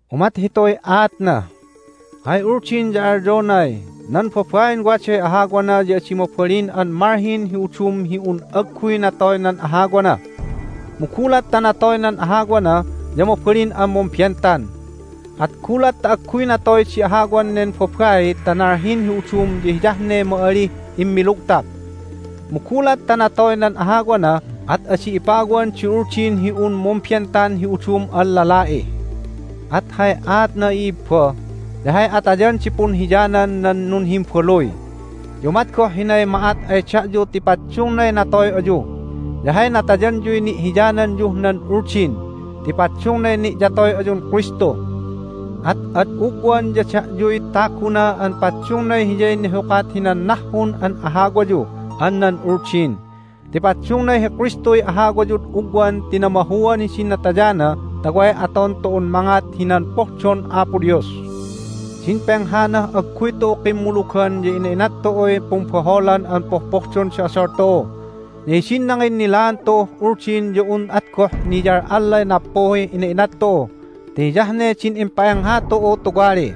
Umat hituy aatna: Hay uldin ya alyonay, "Nan babain waday ahawana ya adi mabalin an malhin hi udum hi un agguy natoy nan ahawana. Mu gulat ta natoy nan ahawana ya mabalin an mumbentan." At gulat ta agguy natoy di ahawan nen babai ta nalhin hi udum ya hiyah ne ma'alih immilugtap. Mu gulat ta natoy nan ahawana at adi ipawan di uldin hi un mumbentan hi udum an lala'i. At hay aatna, i'ibba, ya hay atayan di punhiyanan nan nunhimbaluy. Ya umat goh hinay ma'at ay da'yu ti paddungnay natoy ayu, ya hay natayanyuy ni'hiyananyuh nan Uldin ti paddungnay ni'yatoy ayun Kristu. At ad ugwan ya da'yuy taguna an paddungnay Hiyay nihukat hinan nahhun an ahawayu an nan Uldin, ti paddungnay hi Kristuy ahawayud ugwan ti namahuan hidin natayana ta way aton tu'un mangat hinan pohdon Apo Dios. Din penghanah agguy tu'u kimmulugan ya ina'inat tu'uy pumbaholan an pohpohdon di odol tu'u. Ya hidin nanginnilaan tu'uh Uldin ya un at goh niyal'allay nappuhih ina'inat tu'u ti hiyah ne din impa'engha tu'u tuwali,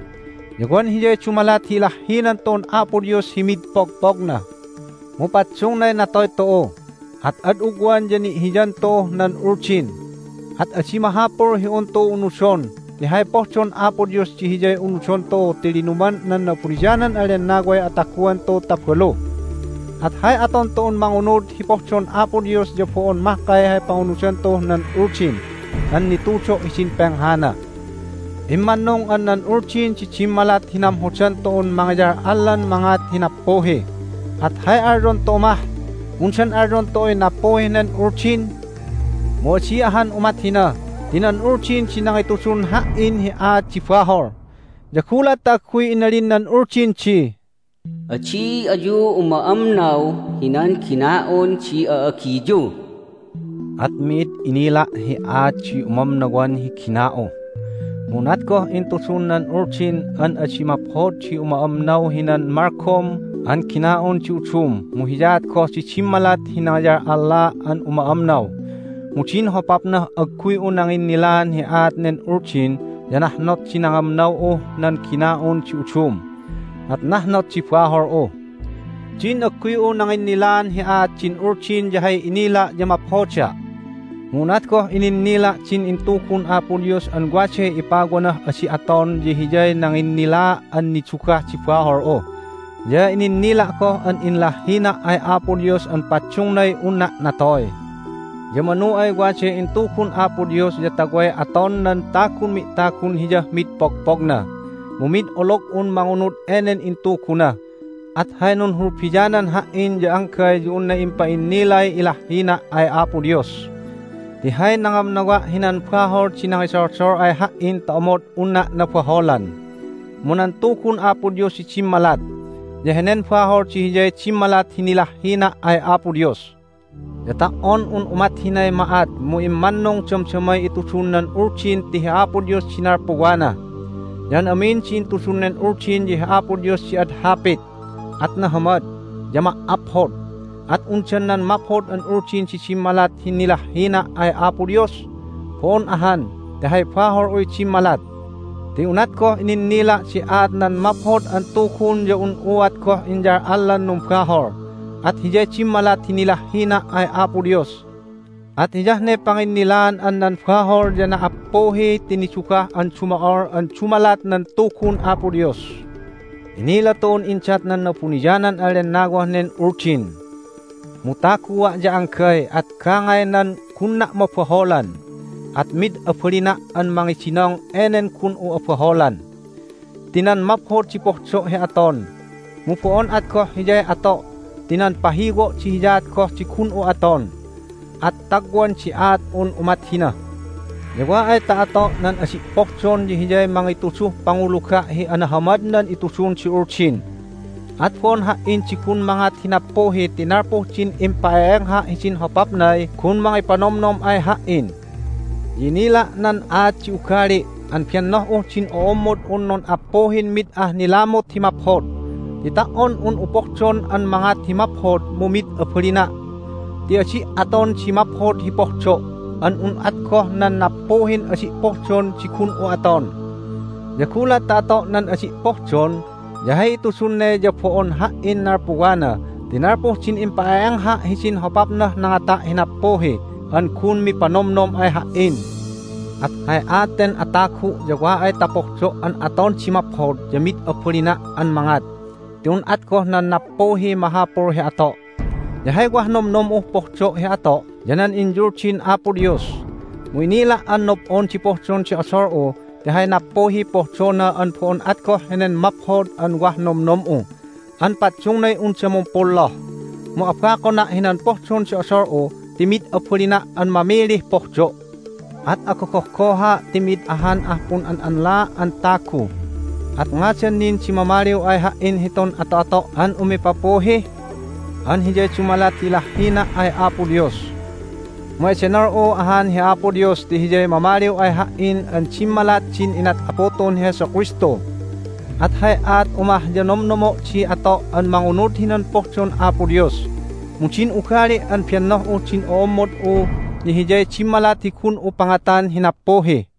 ya wan hiyay dumalat hi ilahhinan tu'un Apo Dios hi mid pogpogna. Mu paddungnay natoy tu'u, at ad ugwan ya ni'hiyan tu'uh nan Uldin, at adi mahapul hi un tu'u unudon ti hay pohdon Apo Dios di hiyay unudon tu'u ti linuman nan Na'abuniyanan an Lennaway ataguan tu'u ta balu. At hay aton tu'un mangunud hi pohdon Apo Dios ya bo'on mahkay hay pangunudan tu'uh nan Uldin an nitudo' hidin penghana. Immannung an nan Uldin di dimmalat hi namhodan tu'un mangiyal'allan mangat hi nappuhi. At hay alyon tu'u mah? Undan alyon tu'uy nappuhih nen Uldin? Mu adi ahan umat hina ti nan Uldin di nangitudun ha"in hi aat di bahol! Ya gulat ta agguy inalin nan Uldin di, "Adi ayu uma'amnaw hinan gina'un di a'agiyu!" at mi'id inila' hi aat di umamnawan hi gina'u! Mu unat goh intudun nan Uldin an adi maphod di uma'amnaw hinan malgom an gina'un di udum mu hiyaat goh di dimmalat hi nangiyal'allaa' an uma'amnaw. Mu din hopapnah agguy'u nanginnilaan hi aat nen Uldin ya nahnot di nangamnaw'uh nan gina'un di udum, at nahnot di bahol'u. Din agguy'u nanginnilaan hi aat din Uldin ya hay inila' ya maphoda'. Mu unat goh ininnila' din intugun Apo Dios an waday ipawanah adi' aton ya hiyay nanginnilaa' an nidugah di bahol'u, ya ininnila' goh an inlahhina' ay Apo Dios an paddungnay unna' natoy! Ya manu ay waday intugun Apo Dios ya ta way aton nan tagun mi'tagun Hiyah mid pogpogna. Mu mid olog'un mangunud enen intuguna, at hay nunhulbianan ha"in ya anggay ya unna impa'innilay ilahhina' ay Apo Dios! Ti hay nangamnawa' hinan bahol di nangidoldol ay ha"in ta omod unna' nabaholan, mu nan Tugun Apo Dios di dimmalat, ya henen bahol di hiyay dimmalat hi nilahhina' ay Apo Dios. Ya ta"on un umat hinay ma'at mu immannung damdamay itudun nan Uldin ti hi Apo Dios di nalpuwana, ya an amin di intudun nen Uldin ya hi Apo Dios di ad hapit, at nahamad, ya ma"aphod. At undan nan maphod an Uldin di dimmalat hi nilahhina' ay Apo Dios? Bo'on ahan, ti hay bahol'uy dimmalat! Ti unat goh ininnila' di aat nan Maphod an Tugun ya un'uat goh inyal'allan numbahol, at hiyay dimmalat hi nilahhina' ay Apo Dios. At hiyah ne panginnilaan an nan bahol ya na"appuhi ti nidugah an dumo'ol an dumalat nan Tugun Apo Dios. Inila tu'un indat nan Na'abuniyanan an Lennawah nen Uldin. Mu tagua' ya anggay, at gangaynan gunna' mabaholan, at mid abalina' an mangidinong enen gun'u abaholan. Ti nan maphod di pohdo' hi aton, mu bo'on at goh hiyay ato' ti nan pahiwo' di hiyaat goh di gun'u aton, at tagwan di aat'un umat hina! Ya wa ay ta ato' nan adi' pohdon ya hiyay mangituduh panguluga' hi anahamad nan itudun di Uldin. At bo'on ha"in di gun mangat hi nappuhi ti nalpuh din impa'e'engha' hidin hopapnay gun mangipanomnom ay ha"in. Ya inila' nan aat di ugali' an bennoh'uh din ommod'un nun'appuhin mid ah nilamut hi maphod. Ti ta"on un'u pohdon an mangat hi maphod mu mid abalina'. Ti adi' aton di maphod hi pohdo', an un at goh nan nappuhin adi' pohdon di gun'u aton. Ya gulat ta ato' nan adi' pohdon ya hay itudun ne ya bo'on ha"in nalpuwana ti nalpuh din impa'e'engha' hidin hopapnah nangata' hi nappuhi an gun mipanomnom ay ha"in. At hay aat ten atagu' ya wa ay ta pohdo' an aton di maphod ya mid abalina' an mangat, ti un at goh nan nappuhiy mahapul hi ato'. Ya hay wah nomnom'uh pohdo' hi ato' ya nan inyuldin Apo Dios. Mu inila' an nob'on di pohdon di odol'u ti hay nappuhiy pohdona an bo'on at goh henen maphod an wah nomnom'u an paddungnay unda mumpolloh. Mu abakona' hinan pohdon di odol'u ti mid abalina' an mamilih pohdo'. At agogohgoha' ti mi'id ahan ah pun'an'anlaa' an tagu! At ngadan nin di mamaliw ay ha"in hitun ato'ato' an umipapuhi? An hiyay dumalat hi ilahhina' ay Apo Dios. Mu edenol'u ahan hi Apo Dios ti Hiyay mamaliw ay ha"in an dimmalat din inat Apu tu'un hi Jesu Kristu! At hay aat'u mah ya nomnomo' di ato' an mangunud hinan pohdon Apo Dios, mu din ugali' an bennoh'uh din ommod'u ya hiyay dimmalat hi gun'u pangatan hi nappuhi.